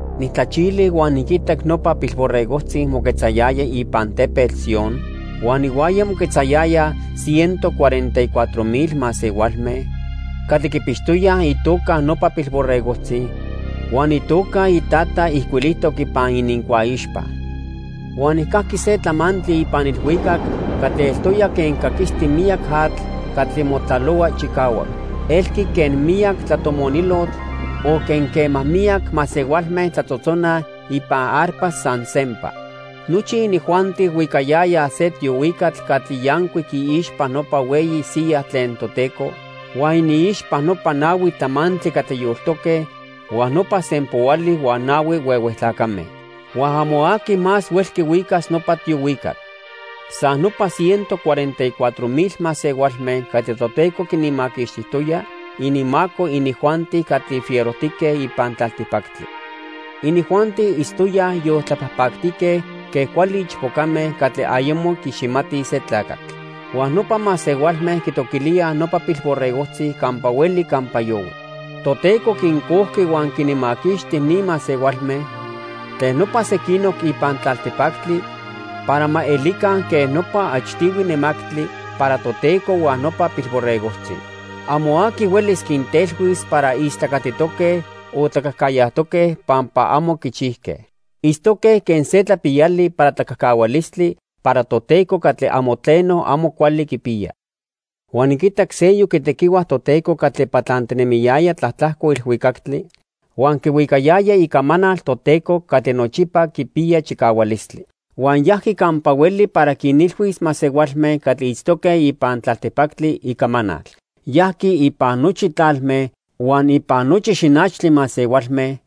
Nijtlachili huan niquitac nopa Pilborregojtzi moquetzayaya ipan Tepetl Sion huan ihuaya moquetzayayaj ciento cuarenta y cuatro mil masehualme catli quipixtoyaj itoca nopa Pilborregojtzi huan itoca iTata ijcuilijtoc ipan inincuaixpa. Huan nijcajqui se tlamantli ipan ilhuicac catli eltoya quen caquisti miyac atl catli motlalohua chicahuac. Elqui quen miyac tlatomonilotl, o quen quema miyac masehualme tlatzotzonaj ipan arpas san sempa. Nochi inijuanti huicayayaj se tiohuicatl catli yancuic iixpa nopa hueyi siya tlen Toteco huan iniixpa nopa nahui tlamantli catli yoltoque huan nopa sempoali huan nahui huehue tlacame. Huan amo aqui más huelqui huicas nopa tiohuicatl. San nopa ciento cuarenta y cuatro mil masehualme catli Toteco quinmaquixtijtoya ininmaco inijuanti catli fierojtique ipan tlaltipactli. Inijuanti itztoyaj yoltlapajpactique quen cuali ichpocame catli ayamo quiiximatij se tlacatl. Huan nopa masehualme quitoquilíaj nopa Pilborregojtzi campa hueli campa yohui. Toteco quincojqui huan quinmaquixti ni masehualme tlen nopa sequinoc ipan tlaltipactli para ma elica quen nopa achtihui nemactli para Toteco huan nopa Pilborregojtzi. Amo aqui huelis quintelhuis para istlacatitoque o tlacajcayajtoque pampa amo quichijque. Itztoque quen se tlapiyali para tlacajcahualistli para Toteco catli amo tleno amo cuali quipiya. Huan niquitac seyoc itequihua Toteco catli patlantinemiyaya tlatlajco ilhuicactli huan quihuicayaya icamanal Toteco catli nochipa quipiya chicahualistli. Huan yajqui campa hueli para quinilhuis masehualme catli itztoque ipan tlaltipactli icamanal. Yajqui ipan nochi tlalme, huan ipan nochi xinachtli masehualme,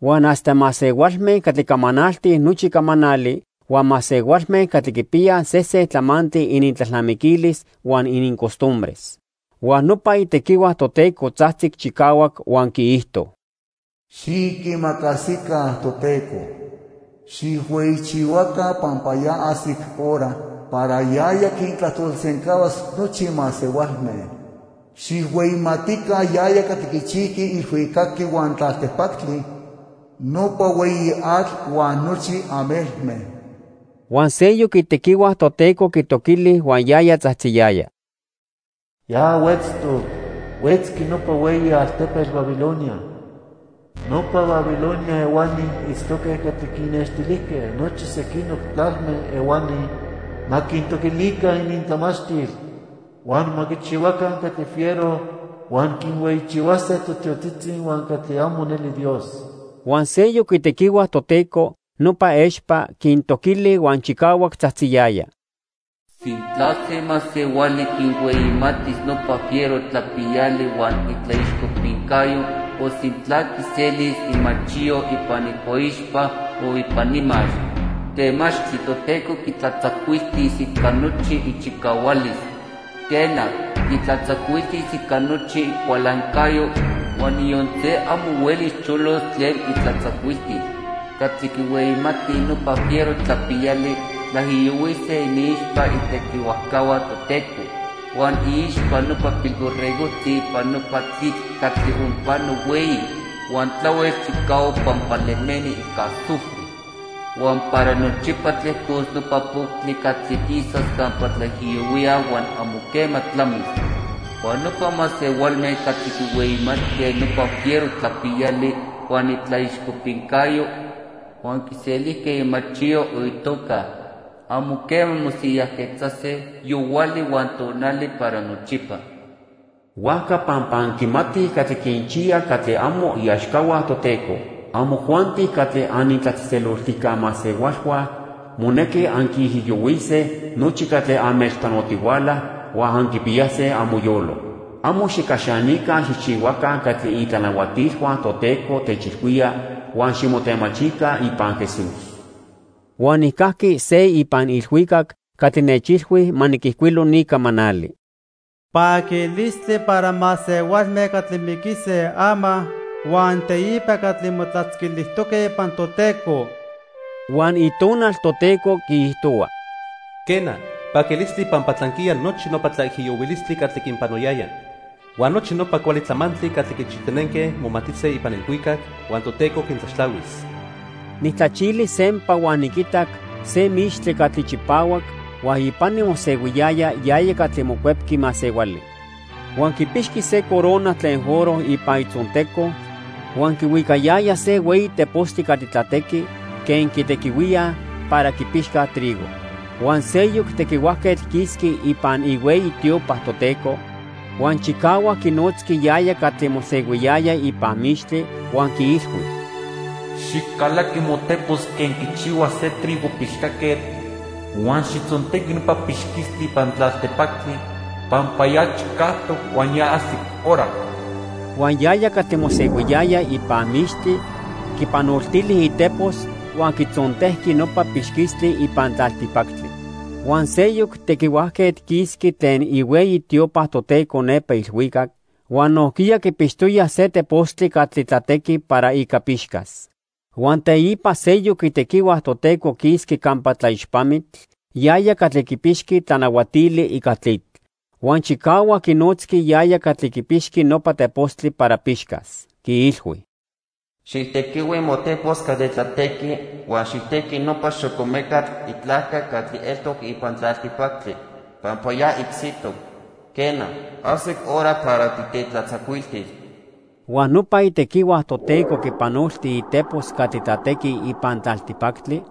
huan hasta masehualme catli camanaltij nochi camanali, huan masehualme catli quipiyaj sesen tlamantli inintlalnamiquilis huan inincostumbres. Huan nopa itequihua Toteco tzajtzic chicahuac huan quiijto: "Xiquimacasica Toteco. Xijhueyichihuaca pampa ya ajsic hora para yaya quintlajtolsencahuas nochi masehualme. Xijhueyimatica yaya catli quichijqui ilhuicactli huan tlaltipactli, nopa hueyi atl huan nochi amelme." Huan seyoc itequihua Toteco quitoquili huan yaya tzajtziyaya: "Ya huetztoc. Huetzqui nopa hueyi altepetl Babilonia. Nopa Babilonia ehuani itztoque catli quinnextilijque nochi sequinoc tlalme ehuani ma quintoquilica inintlamachtil, huan ma quichihuaca catli fiero huan quinhueyichihuase totiotzitzi huan catli amo neli Dios." Huan seyoc itequihua Toteco, nopa expa, quintoquili huan chicahuac tzajtziyaya: "Sintla se masehuali quinhueyimatis nopa fiero tlapiyali huan itlaixcopincayo, o sintla quiselis imachiyo ipan icuaixpa o ipan imax, temachtli Toteco quitlatzacuiltis ica nochi ichicahualis. Quena, quitlatzacuiltis ica nochi icualancayo, huan niyon se amo huelis cholos tlen itlatzacuiltil. Catli quihueyimati nopa fiero tlapiyali tlaijiyohuise iniixpa itequihuajcahua Toteco huan iixpa nopa Pilborregojtzi ipan nopa tlitl catli onpano hueyi huan tlahuel chicahuac pampa lemeni ica azufre. Huan para nochipa tlejcos nopa poctli catli quisas campa tlaijiyohuíaj huan amo quema tlamis. Huan nopa masehualme catli quihueyimatque nopa fiero tlapiyali huan itlaixcopincayo, huan quiselijque imachiyo o itoca, amo quema mosiyajquetzase yohuali huan tonali para nochipa." Huajca pampa anquimatij catli quinchiya catli amo iaxcahua Toteco, amojuanti catli anitlatzejtzeloltijca masehualhua monequi anquiijiyohuise nochi catli anmechpanotihuala huan anquipiyase amoyolo. Amo xijcaxanica xijchihuaca catli itlanahuatilhua Toteco techilhuíaj huan ximotemachica ipan Jesús. Huan nijcajqui se ipan ilhuicac catli nechilhui ma niquijcuilo ni camanali: "Paquilistli para masehualme catli miquise ama huan teipa catli motlatzquilijtoque ipan Toteco." Huan Itonal Toteco quiijtohua: "Quena, paquilistli pampa tlanquiya nochi nopa tlaijiyohuilistli catli quinpanoyayaj. Huan nochi nopa cuali tlamantli catli quichijtinenque momatise ipan ilhuicac, huan Toteco quintlaxtlahuis." Nijtlachili sempa huan niquitac se mixtli catli chipahuac huan ipani mosehuiyaya yaya catli Mocuepqui Masehuali. Huan quipixqui se corona tlen oro ipan itzonteco huan quihuicayaya se hueyi tepostli catli tlatequi quen quitequihuíaj para quipixcaj trigo. Huan seyoc tequihuajquetl quisqui ipan ihueyi tiopa Toteco huan chicahuac quinotzqui yaya catli mosehuiyaya ipan mixtli, huan quiilhui: "Xijcalaqui motepos quen quichihua se trigo pixcaquetl huan xijtzontequi nopa pixquistli ipan tlaltipactli, pampa ya chicajtoc huan ya ajsic hora." Huan yaya catli mosehuiyaya ipan mixtli quipanoltili itepos huan quitzontejqui nopa pixquistli ipan tlaltipactli. Huan seyoc tequihuajquetl quisqui tlen ihueyi tiopa Toteco nepa ilhuicac huan nojquiya quipixtoya se tepostli catli tlatequi para ica pixcas. Huan teipa seyoc itequihua Toteco quisqui campa tlaixpamitl, yaya catli quipixqui tlanahuatili ica tlitl. Huan chicahuac quinotzqui yaya catli quipixqui nopa tepostli para pixcas. Quiilhui: "Xijtequihui motepos catli tlatequi huan xijtequi nopa xocomecatl itlajca catli eltoc ipan tlaltipactli, pampa ya icsitoc. Quena, ajsic hora para titetlatzacuiltis." Huan nopa itequihua Toteco quipanolti itepos catli tlatequi ipan tlaltipactli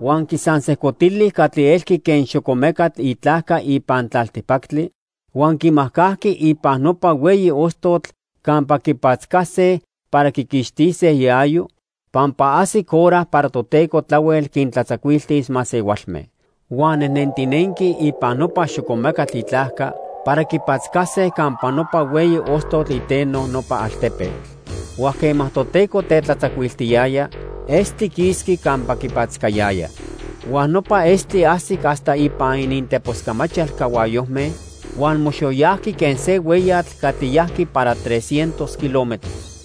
huan quisansejcotili catli elqui quen xocomecatl itlajca ipan tlaltipactli huan quimajcajqui ipan nopa hueyi ostotl campa quipatzcase para quiquixtise iayo, pampa ajsic hora para Toteco tlahuel quintlatzacuiltis masehualme. Huan nejnentinenque ipan nopa xocomecatl itlajca para quipatzcase campa nopa hueyi ostotl iteno nopa altepetl. Huan quema Toteco tetlatzacuiltiyaya, estli quisqui campa quipatzcayaya. Huan nopa estli ajsic hasta ipan ininteposcamachal cahuayojme huan moxoyajqui quen se hueyatl catli yajqui para tres cientos kilómetros.